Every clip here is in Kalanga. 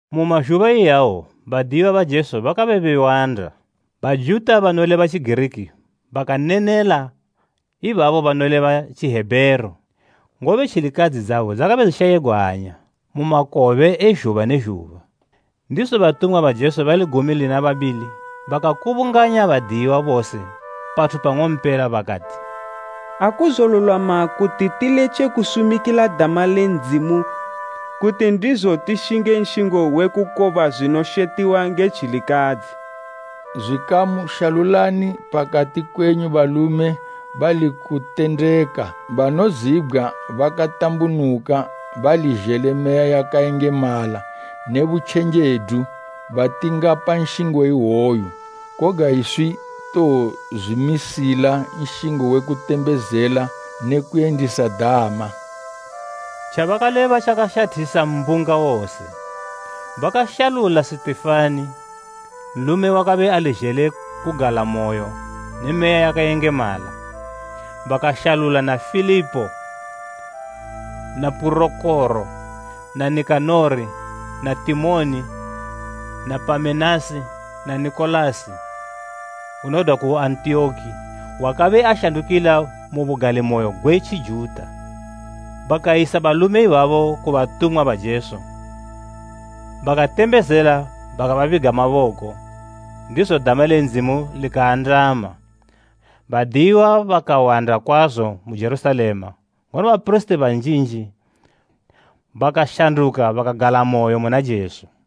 Mu mazhuba iyawo badiyiwa ba Jesu bakabe bewanda, Bajuta banoleba Tjigiriki bakanenela ibabo banoleba Tjihebheru, ngobe tjilikadzi idzedzo dzakabe dzishayigwa hanya mu makobe e zhuba ne zhuba. Ndizo batumwa ba Jesu bali gumi lina babili bakakubunganya badiyiwa bose pathu pang'ompela bakati, “Akuzolulwama kuti tiletje kusumikila dama le Ndzimu kuti ndizo tishinge nshingo wekukoba zwinoshetiwa nge tjilikadzi. Zwikamu, shalulani pakati kwenyu balume bali kutendeka banozibgwa bakatambunuka bali zhele Meya yakayengemala ne butjenjedu, batingapa nshingo iwoyu. Koga iswi towozwimisila nshingo we kutembezela ne kuyendisa dama.” Tjabakaleba tjakashathisa mbunga wose. Bakashalula Sitifani, nlume wakabe ali zhele kugalamoyo ne Meya yakayengemala. Bakashalula na Filipo na Purokoro na Nikanori na Timoni na Pamenasi na Nikolasi unodwa ku Antiyoki wakabe ashandukila mu bugalimoyo gwe Tjijuta. Bakayisa balume ibabo ku batumwa ba Jesu, bakatembezela bakababiga maboko. Ndizo dama le Ndzimu likaandama. Badiyiwa bakawanda kwazo mu Jerusalema ngono bapirisiti banjinji bakashanduka bakagalamoyo muna Jesu.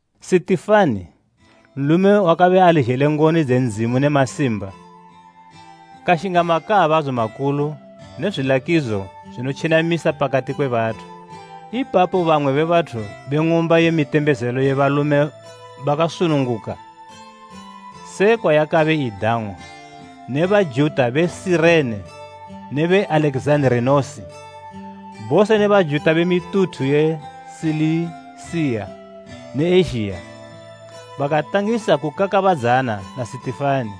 Sitifani, nlume wakabe ali zhele ngoni dze Ndzimu ne masimba, kashinga makaabadzo makulu ne zwilakidzo zwinotjenamisa pakati kwe bathu. Ipapo bamwe be bathu be Ng'umba ye mitembezelo ye Balume bakasununguka (sekwa yakabe idang'wa) ne Bajuta be Sirene ne be Alekizanda, bose ne Bajuta be mituthu ye Silisiya ne Ezhiya bakatangisa kukakabadzana na Sitifani.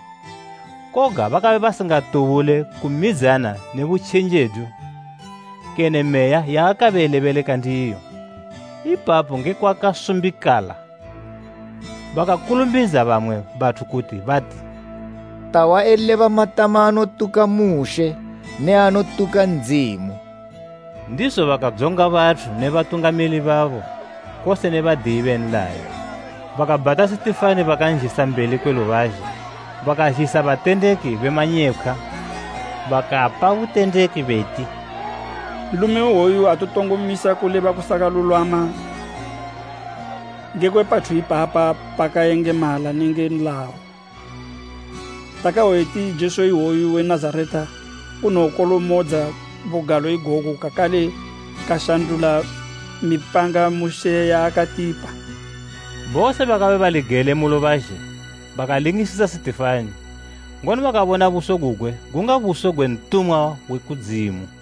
Koga bakabe basingatubule kumidzana ne butjenjedu kene Meya yaakabe elebeleka ndiyo. Ipapo nge kwakasumbikala bakakulumbidza bamwe bathu kuti bati, “Tahwa eleba matama anotuka Mushe ne anotuka Ndzimu.” Ndizo bakadzonga bathu ne batungamili babo kose ne badiyi be nlayo. Bakabhata Sitifani bakanzhisa mbeli kwe lubazhe. Bakazhisa batendeki be manyepkhwa bakapa butendeki beti, “Nlume iwoyu aatotongo misa kuleba kusakalulwama ngekwe pathu ipapa pakayengemala nenge nlayo. Takahwa eti Jesu iwoyu we Nazareta unowokolomodza bugalo igogu kakale kashandula mipanga Mushe yaakatipa.” Bose bakabe bali gele mu lubazhe bakalingisisa Sitifani, ngono bakabona buso gugwe gunga buso gwe ntumwa we kudzimu.